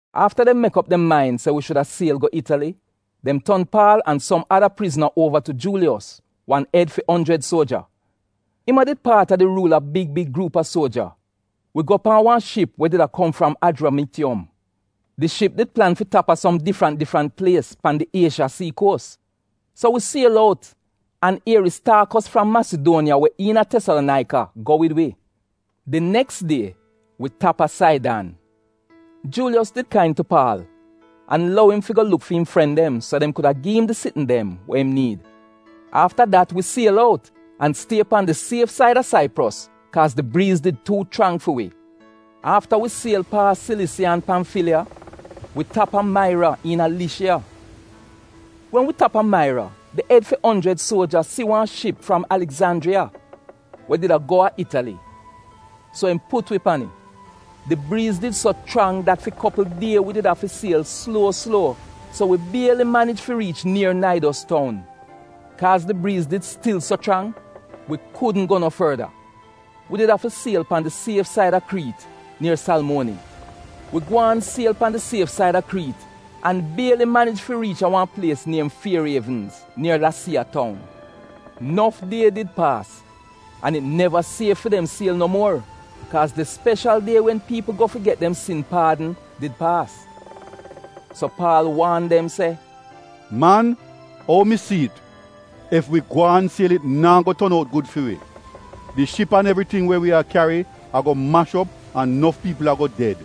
Afta dem mek op dem main se wi shuda siel go Itali, dem ton Paal an som ada prizna uova tu Juuliyos wan ed fi onjrid suoja. Im a did paat a di ruula big big gruup a suoja. Wi go pan wan ship we did a kom fram Ajramitiyom. Di ship did plan fi tap a som difrant difrant plies pan di Iezha sii kuos. So wi siel out an Ieristaakos fram Masiduoniya we iina Tesalonaika go wid wi. Di neks die wi tap a Saidan. Juuliyos did kain tu Paal an lou im fi go luk fi im fren dem so dem kuda gi im di sitn dem we im niid. Afta dat wi siel out an stie pan di sief said a Saipros kaaz di briiz did tuu chrang fi wi. Afta wi siel paas Silisiya an Pamfiliya, wi tap a Maira iina Lishiya. Wen wi tap a Maira di ed fi onjrid suoja si wan ship fram Aligzanjriya we did a go a Itali, so im put wi pan it. Di briiz did so chrang dat fi kopl die, wi did afi siel sluo sluo so wi bieli manij fi riich nier Naidos toun. Kaaz di briiz did stil so chrang, wi kudn go no forda, wi did afi siel pan di sief said a Kriit nier Salmuoni. Wi gwaan siel pan di sief said a Kriit an bieli manij fi riich a wan plies niem Fier Ievnz nier Lasiiya toun. Nof die did paas an it neva sief fi dem siel no muor kaaz di speshal die wen piipl go fi get dem sin paadn did paas. So Paal waan dem se, “Man ou mi si'it, ef wi gwaan siel it naa go ton out gud fi wi. Di ship an evriting we wi a kyari ago mash op an nof piipl ago ded.”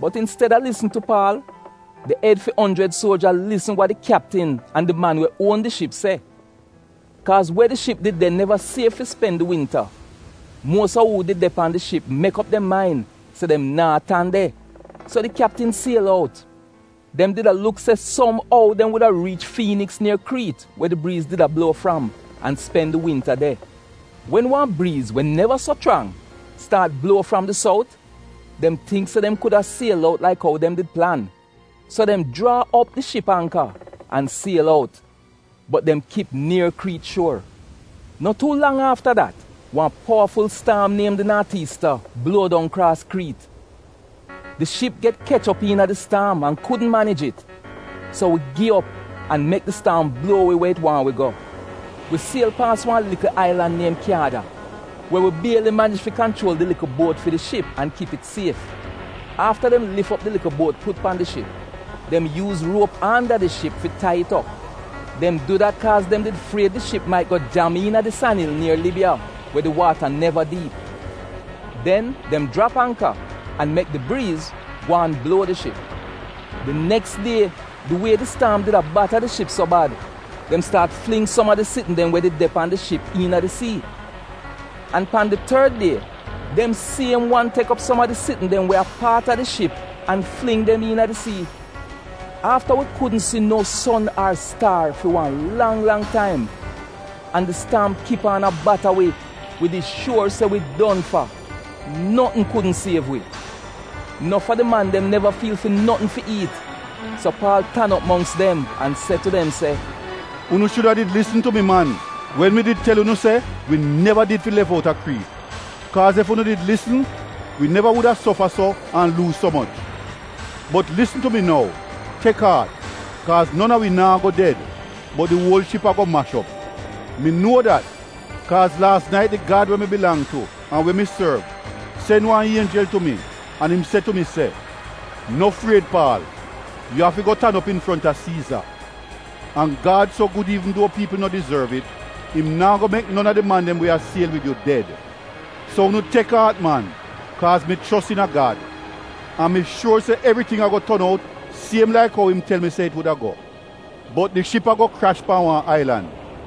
Bot insteda lisn tu Paal, di ed fi onjrid suoja lisn wa di kyaptin an di man we uon di ship se. Kaaz we di ship did de neva sief fi spen di winta, muos a uu did de pan di ship mek op dem main se dem naa tan de, so di kyaptin siel out. Dem did a luk se som ou dem wuda riich Fiiniks nier Kriit we di briiz did a bluo fram an spen di winta de. Wen wan briiz we neva so chrang staat bluo fram di sout, dem tingk se dem kuda siel out laik ou dem did plan, so dem jraa op di ship angka an siel out. Bot dem kip nier Kriit shuor. No tuu lang afta dat wan powaful staam niem di “Naatiista” bluo dong kraas Kriit. Di ship get kech op iina di staam an kudn manij it, so wi gi op an mek di staam bluo wi we it waahn wi go. Wi siel paas wan likl ailan niem Kyaada, we wi bieli manij fi kanchuol di likl buot fi di ship an kip it sief. Afta dem lif op di likl buot put pan di ship, dem yuuz ruop anda di ship fi tai it op. Dem du dat kaaz dem did fried di ship mait go jam iina di san il nier Libiya we di waata neva diip. Den dem jrap angka an mek di briiz gwaan bluo di ship. Di neks die di wie di staam did a bata di ship so bad, dem staat fling som a di sitn dem we did de pan di ship iina di sii. An pan di tord die, dem siem wan tek op som a di sitn dem we a paat a di ship an fling dem iina di sii. Afta wi kudn si no son ar staar fi wan lang lang taim, an di staam kip aan a bata wi, wi did shuor se wi don fa, notn kudn siev wi. Nof a di man dem neva fiil fi notn fi iit, so Paal tan op mongks dem an se tu dem se, “Unu shuda did lisn tu mi man wen mi did tel unu se wi neva did fi lef outa Kriit. Kaaz ef unu did lisn, wi neva wuda sofa so an luuz so moch. Bot lisn tu mi nou, tek aat, kaaz non a wi naa go ded, bot di uol ship ago mash op. Mi nuo dat kaaz laas nait di Gad we mi bilang tu an we mi sorv sen wan ienjel tu mi an im se tu mi se, ‘No fried Paal! Yu afi go tan op infronta Siiza, an Gad so gud iivn duo piipl no dizorv it, im naa go mek non a di man dem we a siel wid yu ded.’ So unu tek aat man, kaaz mi chos iina Gad. An mi shuor se evriting ago ton out siem laik ou im tel mi se it wuda go. Bot di ship ago krash pan wan ailan.”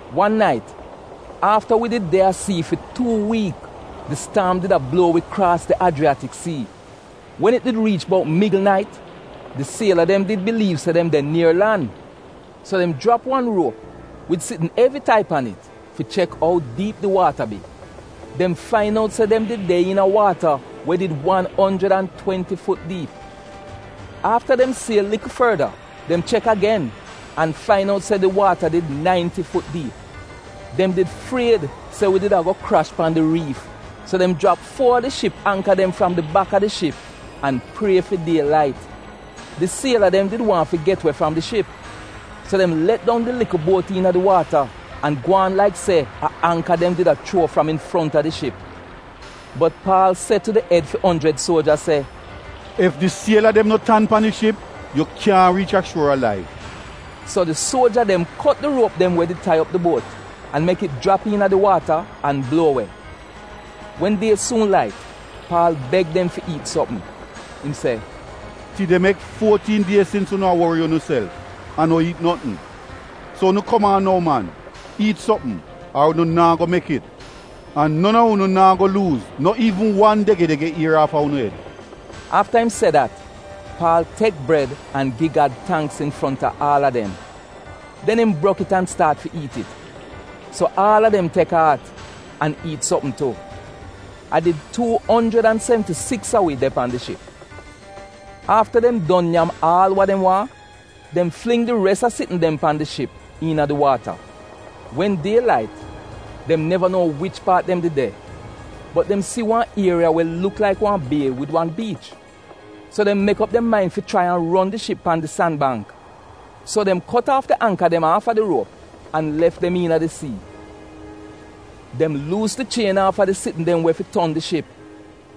Wan nait, afta wi did de a sii fi tuu wiik, di staam did a bluo wi kraas di Ajriyatik Sii. Wen it did riich bout migl nait, di siela dem did biliiv se dem de nier lan. So dem jrap wan ruop wid sitn evi tai tu it fi chek ou diip di waata bi. Dem fain out se dem di de wan onjrid an twenti fut diip. Afta dem siel likl forda dem chek agen an fain out se di waata did nainti fut diip. Dem did fried se wi did ago krash pan di riif, so dem jrap fuo a di ship angka dem fram di baka di ship, an prie fi die lait. Di siela dem did waahn fi get we fram di ship, so dem let dong di likl buot iina di waata an gwaan laik se a angka dem did a chuo fram infronta di ship. Bot Paal se tu di ed fi onjrid suoja se, “Ef di siela dem no tan pan di ship yu kyaahn riich a shuor alaiv.” So di suoja dem kot di ruop dem we did tai op di buot an mek it jrap iina di waata an bluo we. Wen die suun lait, Paal beg dem fi iit sopm. Im se, “Tide mek fuotiin die sins unu a wori unuself an no iit notn. So unu kom aan nou man, iit sopm, ar unu naa go mek it. An non a unu naa go luuz no iivn wan dege-dege ier aaf a unu ed.” Afta im se dat, Paal tek bred an gi Gad tangks infronta aal a dem. Den im brok it an staat fi iit it. So aal a dem tek aat an iit sopm tu. A did tuu onjrid an sevnti-siks a wi de pan di ship. Afta dem don nyam aal wa dem waahn, dem fling di res a sitn dem pan di ship iina di waata. Wen die lait, dem neva rekanaiz di plies, bot dem si wan ieriya we luk laik wan bie wid wan biich. So dem mek op dem main fi chrai an ron di ship pan di san bangk. So dem kot aaf di angka dem aafa di ruop an lef dem iina di sii. Dem luus di chien aafa di sitn dem we fi ton di ship,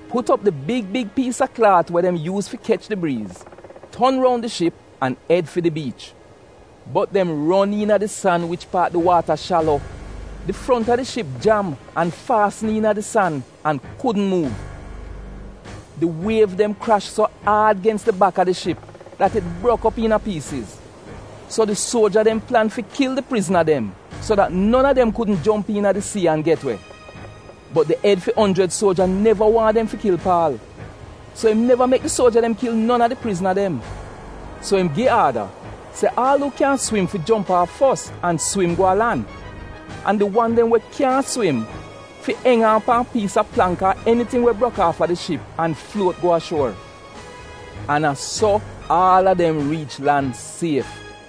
put op di big big piis a klaat we dem yuuz fi kech di briiz, ton roun di ship an ed fi di biich. Bot dem ron iina di san wich paat di waata shalo. Di front a di ship jam an faasn iina di san an kudn muuv. Di wiev dem krash so aad gens di baka di ship dat it brok op iina piisiz. So di suoja dem plan fi kil di prizna dem so dat non a dem kudn jomp iina di sii an get we. Bot di ed fi onjrid suoja neva waahn dem fi kil Paal, so im neva mek di suoja dem kil non a di prizna dem. So im gi aada se aal uu kyan swim fi jomp aaf fos an swim go a lan, an di wan dem we kyaahn swim fi enj aan pan piis a plangk ar eniting we brok aafa di ship an fluot go a shuor. An a so aal a dem riich lan sief.